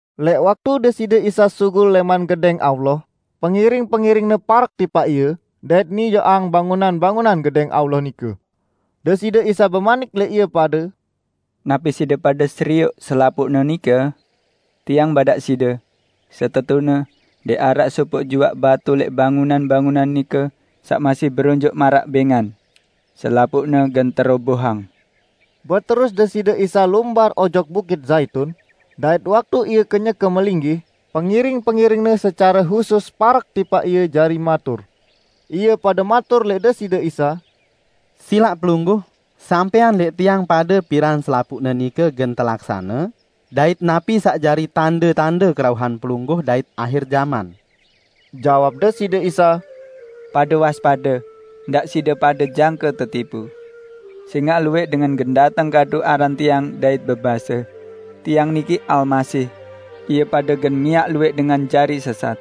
Lẽq waktu Deside Isa sugul lẽman Gedẽng Allah, pengiring-pengiring-Ne parek tipaq Ie, dait nijoqang bangunan-bangunan Gedẽng Allah nike. Deside Isa bemanik lẽq ie pade, "Napi side pade serioq selapuqne nike? Tiang badaq side: Setetune ndẽq araq sopoq juaq batu lẽq bangunan-bangunan nike saq masih beronjoq maraq bẽngan. Selapuqne gen terobohang." Beterus Deside Isa lumbar ojok Bukit Zaitun, dait waktu Ie kenyeke melinggih, pengiring-pengiring-Ne secare husus parek tipaq Ie jari matur. Ie pade matur lẽq Deside Isa, "Silaq Pelungguh, sampẽang lẽq tiang pade piran selapuqne nike gen telaksane dait napi saq jari tande-tande kerauhan Pelungguh dait ahir jaman?" Jawab Deside Isa, "Pade waspade, ndaq side pade jangke tetipu. Sẽngaq luwẽq dengan gen dateng kadu aran Tiang dait bebase, 'Tiang niki Almasih!' Ie pade gen miaq luwẽq dengan jari sesat.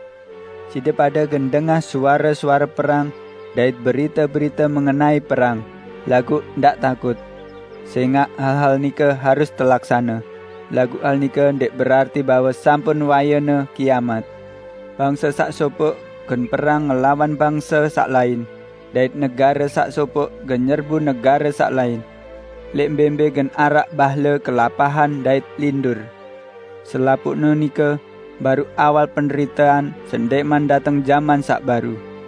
Side pade gen dengah suare-suare perang dait berite-berite mengenai perang, laguq ndaq takut. Sẽngaq hal-hal nike harus telaksane, laguq hal nike ndẽq berarti bahwe sampun wayene kiamat. Bangse saq sopoq gen perang ngelawan bangse saq lain, dait negare saq sopoq gen nyerbu negare saq lain. Lẽq mbẽ-mbẽ gen araq bahle kelapahan dait lindur. Selapuqne nike baruq awal penderitean sendẽqman dateng jaman saq baru.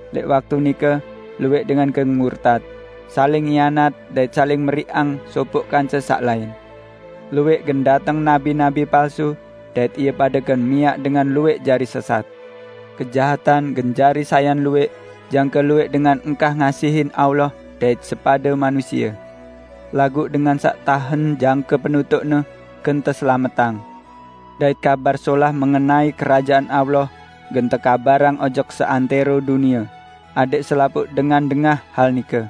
Lẽq waktu nike, luwẽq dengan gen murtat, saling hianat dait saling meriqang sopoq kance saq lain. Luwẽq gen dateng nabi-nabi palsu dait ie pade gen miaq dengan luwẽq jari sesat. Kejahatan gen jari sayan luwẽq jangke luwẽq dengan engkah ngasihin Allah dait sepade manusie. Laguq dengan saq tahen jangke penutuqne, gen teselametang. Dait Kabar Solah mengenai Kerajaan Allah gen tekabarang ojok seantẽro dunie, adẽq selapuq dengan dengah hal nike.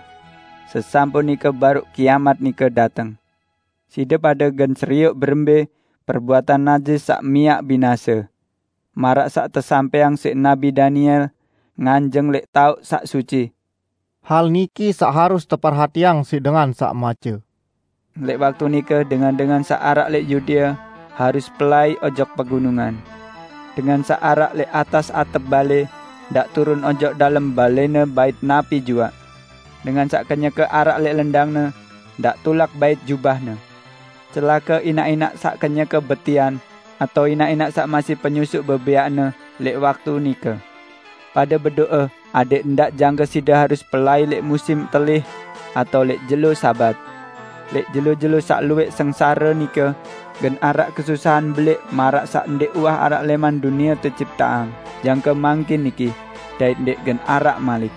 Sesampun nike baruq kiamat nike dateng." "Side pade gen serioq berembẽ 'Perbuatan najis saq miaq binase', maraq saq tesampẽang siq Nabi Daniel, nganjeng lẽq taoq saq suci (hal niki saq harus teperhatiang siq dengan saq mace). Lẽq waktu nike dengan-dengan saq araq lẽq Yudea harus pelai ojok pegunungan. Dengan saq araq lẽq atas atep balẽ, ndaq turun ojok dalem balẽne bait napi juaq. Dengan saq kenyeke araq lẽq lendangne, ndaq tulak bait jubahne. Celake inaq-inaq saq kenyeke betian, atao inaq-inaq saq masih penyusuq bebẽaqne lẽq waktu nike! Pade bedo'e adẽq ndaq jangke side harus pelai lẽq musim telih atao lẽq jelo Sabat! Lẽq jelo-jelo saq luwẽq sengsare nike, gen araq kesusahan belẽq maraq saq ndẽq uwah araq lẽman dunie tecipteang jangke mangkin niki, dait ndẽq gen araq malik.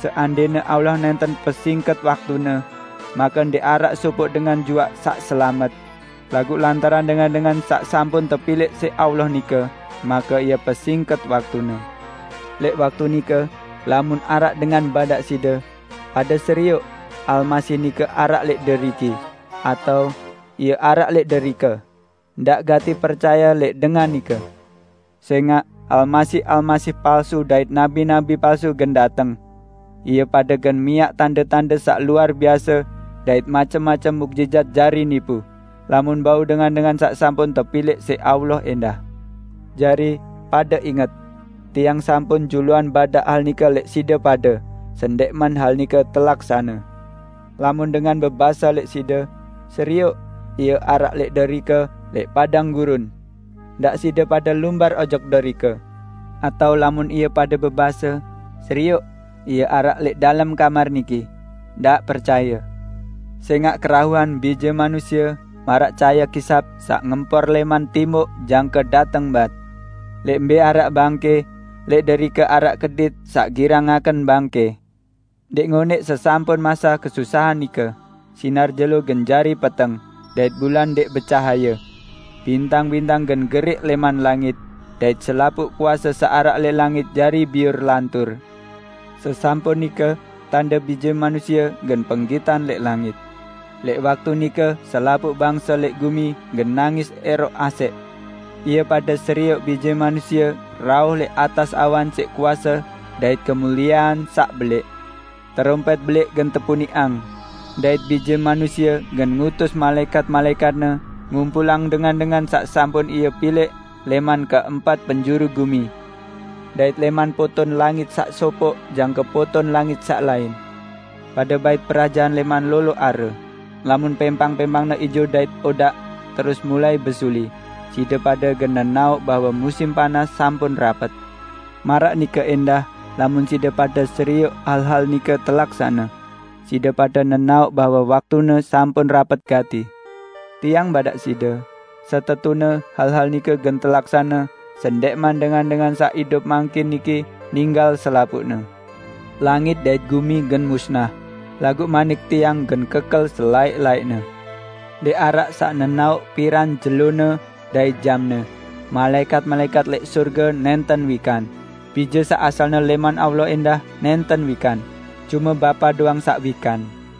Seandẽne Allah nẽnten pesingket waktune; make ndẽq araq sopoq dengan juaq saq selamet. Laguq lantaran dengan-dengan saq sampun tepilẽq siq Allah nike, make Ie pesingket waktune. Lẽq waktu nike, lamun araq dengan badaq side, 'Pade serioq, Almasih nike araq lẽq deriki!' atao 'Ie araq lẽq derike!' -- ndaq gati percaye lẽq dengan nike. Sẽngaq almasih-almasih palsu dait nabi-nabi palsu gen dateng. Ie pade gen miaq tande-tande saq luar biase dait macem-macem muqjizat jari nipu, lamun bau dengan-dengan saq sampun tepilẽq siq Allah ẽndah. Jari, pade inget! Tiang sampun juluan badaq hal nike lẽq side pade sendẽqman hal nike telaksane. Lamun dengan bebase lẽq side, 'Serioq, Ie araq lẽq derike lẽq padang gurun!' -- ndaq side pade lumbar ojok derike. Atao lamun ie pade bebase, 'Serioq, Ie araq lẽq dalem kamar niki!' -- ndaq percaye. Sẽngaq kerauhan Bije Manusie maraq cahaye kisap saq ngempor lẽman timuq jangke dateng bat. Lẽq mbẽ araq bangkẽ, lẽq derike araq kedit saq girang ngaken bangkẽ." "Ndẽq ngonẽq sesampun mase kesusahan nike, sinar jelo gen jari peteng, dait bulan ndẽq becahaye. Bintang-bintang gen geriq lẽman langit, dait selapuq kuase saq araq lẽq langit jari biur lantur. Sesampun nike, tande Bije Manusie gen penggitan lẽq langit. Lẽq waktu nike selapuq bangse lẽq gumi gen nangis ẽroq asẽq. Ie pade serioq Bije Manusie rauh lẽq atas awan siq kuase dait kemuliean saq belẽq. Terompẽt belẽq gen tepuniqang, dait Bije Manusie gen ngutus malaẽkat-malaẽkat-Ne ngumpulang dengan-dengan saq sampun Ie pilẽq lẽman keempat penjuru gumi, dait lẽman poton langit saq sopoq jangke poton langit saq lain." "Pade bait perajahan lẽman lolo are. Lamun pẽmpang-pẽmpangne ijo dait odaq, terus mulai besuli, side pade gen nenaoq bahwe musim panas sampun rapet. Maraq nike ẽndah lamun side pade serioq hal-hal nike telaksane, side pade nenaoq bahwe waktune sampun rapet gati. Tiang badaq side: Setetune hal-hal nike gen telaksane sendẽqman dengan-dengan saq idup mangkin niki ninggal selapuqne. Langit dait gumi gen musnah, laguq manik Tiang gen kekel selaẽq-laẽqne." "Ndẽq araq saq nenaoq piran jelone dait jamne, malaẽkat-malaẽkat lẽq sorge nẽnten wikan, Bije saq asalne lẽman Allah ẽndah nẽnten wikan, cume Bapa doang saq wikan.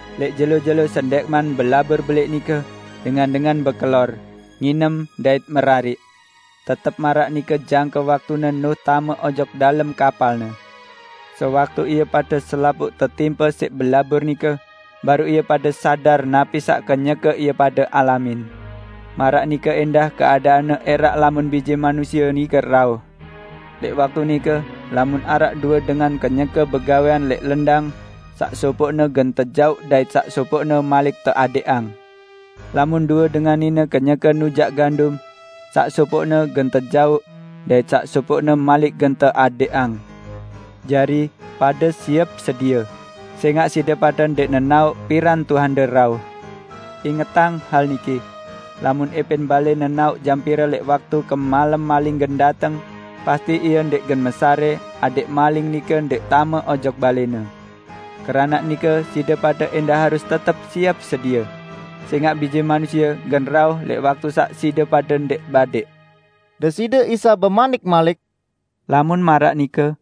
Lẽq jelo-jelo sendẽqman belabur belẽq nike, dengan-dengan bekelor, nginem dait merariq. Tetep maraq nike jangke waktune Nuh tame ojok dalem kapalne. Sewaktu ie pade selapuq tetimpe siq belabur nike, baruq ie pade sadar napi saq kenyeke ie pade alamin. Maraq nike ẽndah keadaanne ẽraq lamun Bije Manusie nike rauh. Lẽq waktu nike, lamun araq due dengan kenyeke begawẽan lẽq lendang: Saq sopoqne gen tejauq dait saq sopoqne malik teadẽqang. Lamun due dengan nine kenyeke nujaq gandum: Saq sopoqne gen tejauq, dait saq sopoqne malik gen teadẽqang. Jari, pade siep sedie, sẽngaq side pade ndẽq nenaoq piran Tuhande rauh. Ingetang hal niki! Lamun ẽpẽn balẽ nenaoq jam pire lẽq waktu kemalem maling gen dateng, pasti ie ndẽq gen mesarẽ adẽq maling nike ndẽq tame ojok balẽne. Keranaq nike, side pade ẽndah harus tetep siep sedie. Sẽngaq Bije Manusie gen rauh lẽq waktu saq side pade ndẽq badẽq." Deside Isa bemanik malik, "Lamun maraq nike,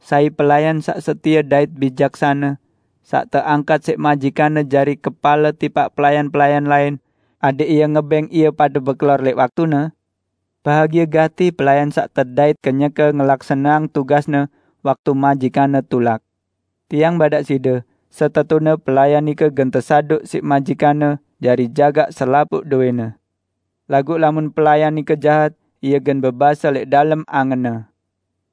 sai pelayan saq setie dait bijaksane, saq teangkat siq majikanne jari kepale tipaq pelayan-pelayan lain, adẽq ie ngebẽng ie pade bekelor lẽq waktune? Bahagie gati pelayan saq tedait kenyeke ngelaksaneang tugasne waktu majikanne tulak. Tiang badaq side: Setetune pelayan nike gen tesaduq siq majikanne jari jagaq selapuq dowẽne. Laguq lamun pelayan nike jahat, ie gen bebase lẽq dalem angenne,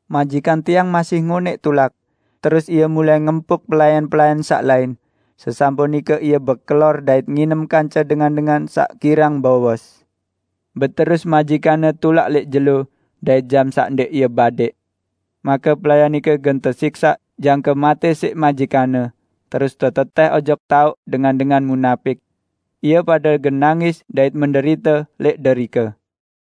'Majikan tiang masih ngonẽq tulak,' terus ie mulai ngempuk pelayan-pelayan saq lain, sesampun nike ie bekelor dait nginem kance dengan-dengan saq girang bowos. Beterus majikanne tulak lẽq jelo dait jam saq ndẽq ie badẽq. Make pelayan nike gen tesiksaq jangke matẽ siq majikanne, terus tetetẽh ojok taoq dengan-dengan munapik. Ie pade gen nangis dait menderite lẽq derike."